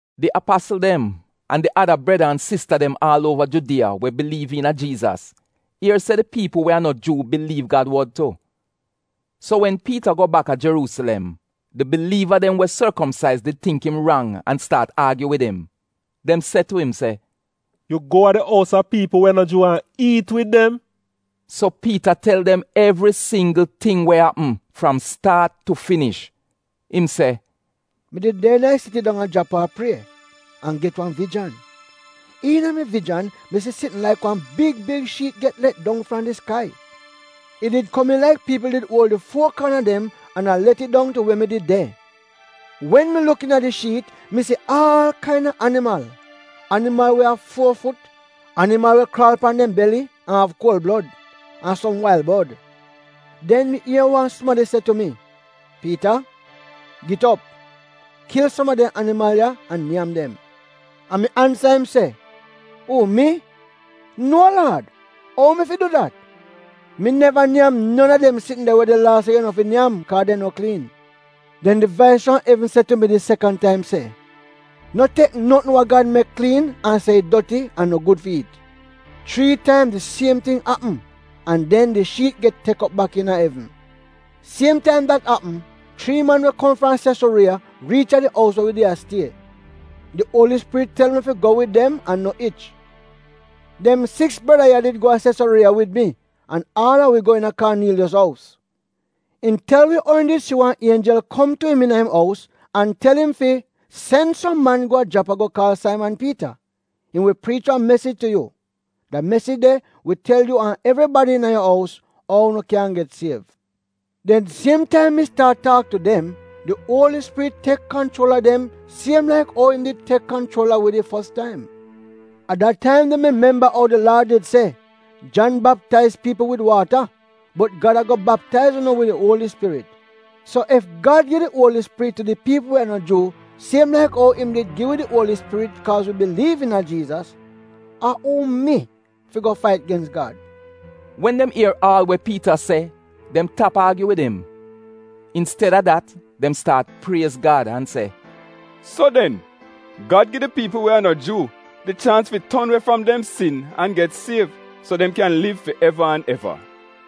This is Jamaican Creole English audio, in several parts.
Di apasl dem an di ada breda an sista dem aal uova Judiya we biliiv iina Jiizas ier se di piipl we a no Juu biliiv Gad wod tu. So wen Piita go baka Jeruusilem, di biliiva dem we sorkomsaiz did tingk im rang an staat aagyu wid im. Dem se tu im se, “Yu go a di ous a piipl we a no Juu an iit wid dem?” So Piita tel dem evri singgl ting we apm fram staat tu finish. Im se, “Mi did de iina di siti dong a Japa a prie an get wan vijan. Iina mi vijan mi si sitn laik wan big big shiit get let dong fram di skai. It did komiin laik piipl did uol di fuo kaana dem an a let it dong tu we mi did de. Wen mi luk iina di shiit mi si aal kain-a animal: animal we av fuo fut, animal we kraal pan dem beli an av kuol blod, an som wail bod. Den mi ier wan sumadi se tu mi, ‘Piita, git op. Kil som a dem animal ya an nyam dem.’ “An mi ansa im se, ‘Uu mi? Nuo Laad, ou mi fi du dat? Mi neva nyam non a dem de sitn de we di Laa se yu no fi nyam kaaz dem no kliin.’ “Den di vais fram evn se tu mi di sekan taim se, ‘No tek notn we Gad mek kliin an se it doti an no gud fi iit.’ Chrii taim di siem ting apm, an den di shiit get tek op bak iina evn. “Siem taim dat apm chrii man we kom fram Sesuriiya riich a di ous we wi did a stie. Di Uoli Spirit tel mi fi go wid dem an no ich. Dem siks breda ya did go a Sesuriiya wid mi an aal a wi go iina Kaaniiliyos ous. Im tel wi ou im did si wan ienjel kom tu im iina im ous an tel im fi, ‘Sen som man go a Japa go kaal Saiman Piita. Im wi priich wan mesij tu yu. Da mesij de wi tel yu an evribadi iina yu ous ou unu kyan get siev.’ “Den siem taim mi staat taak tu dem, di Uoli Spirit tek kanchuol a dem siem laik ou im did tek kanchuol a wi di fos taim. A da taim de mi memba ou di Laad did se: ‘Jan baptaiz piipl wid waata, bot Gad a-go baptaiz unu wid di Uoli Spirit.’ So ef Gad gi di Uoli Spirit tu di piipl we a no Juu siem laik ou im did gi wi di Uoli Spirit kaaz wi biliiv iina Jiizas, a uu mi fi go fait gens Gad?” Wen dem ier aal we Piita se dem tap aagyu wid im. Insted-a dat dem staat priez Gad an se, “So den Gad gi di piipl we a no Juu di chaans fi ton we fram dem sin an get siev so dem kyan liv fi eva an eva.”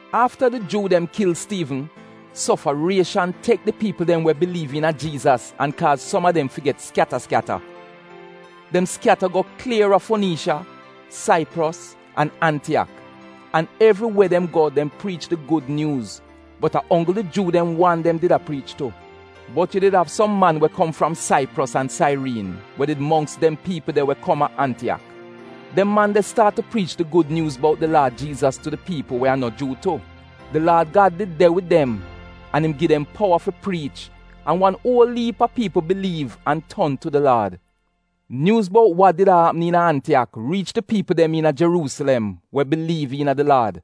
Afta di Juu dem kil Stiivn, sofarieshan tek di piipl dem we biliiv iina Jiizas an kaaz som a dem fi get skyata skyata. Dem skyata go klier a Foniisiya, Saipros, an Antiyak, an evriwe dem go dem priich di gud nyuuz, bot a onggl di Juu dem wan dem did a priich tu. Bot yu did av som man we kom fram Saipros an Sairiin we did mongks dem piipl de we kom a Antiyak. Dem man de staat tu priich di gud nyuuz bout di Laad Jiizas tu di piipl we a no Juu tu. Di Laad Gad did de wid dem an im gi dem powa fi priich an wan uol iip a piipl biliiv an ton tu di Laad. Nyuuz bout wa did a apm iina Antiyak riich di piipl dem iina Jeruusilem we biliiv iina di Laad,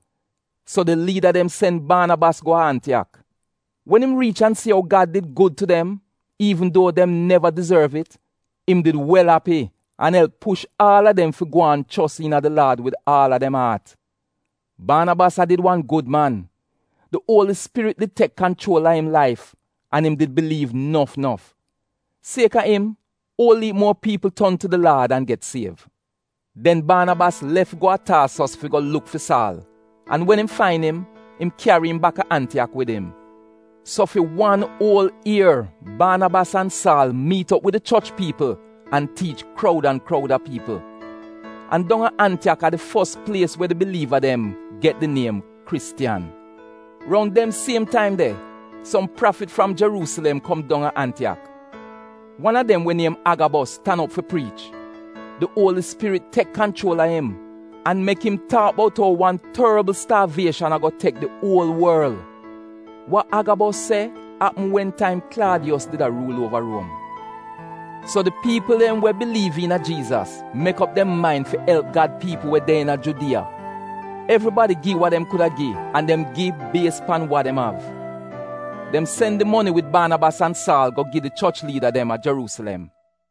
so di liida dem sen Baanabas go a Antiyak. Wen im riich an si ou Gad did gud tu dem iivn duo dem neva dizorv it, im did wel api an elp push aal a dem fi gwaan chos iina di Laad wid aal a dem aat. Baanabas a did wan gud man. Di Uoli Spirit did tek kanchuol a im laif an im did biliiv nof nof. Siek-a im, uol iip muor piipl ton tu di Laad an get siev. Den Baanabas lef go a Taasos fi go luk fi Saal, an wen im fain im, im kyari im baka Antiyak wid im. So fi wan uol ier Baanabas an Saal miit op wid di choch piipl an tiich kroud an kroud a piipl. An dong a Antiyak a di fos plies we di biliiva dem get di niem Kristiyan. Roun dem siem taim de som prafit fram Jeruusilem kom dong a Antiyak. Wan a dem we niem Agabos tan op fi priich. Di Uoli Spirit tek kanchuol a im an mek im taak bout ou wan torbl staavieshan a-go tek di uol worl. (Wa Agabos se apm wen taim Klaadiyos did a ruul uova Ruom.) So di piipl dem we biliiv iina Jiizas mek op dem main fi elp Gad piipl we de iina Judiya. Evribadi gi wa dem kuda gi an dem gi bies pan wa dem av. Dem sen di moni wid Baanabas an Saal go gi di choch liida dem a Jeruusilem.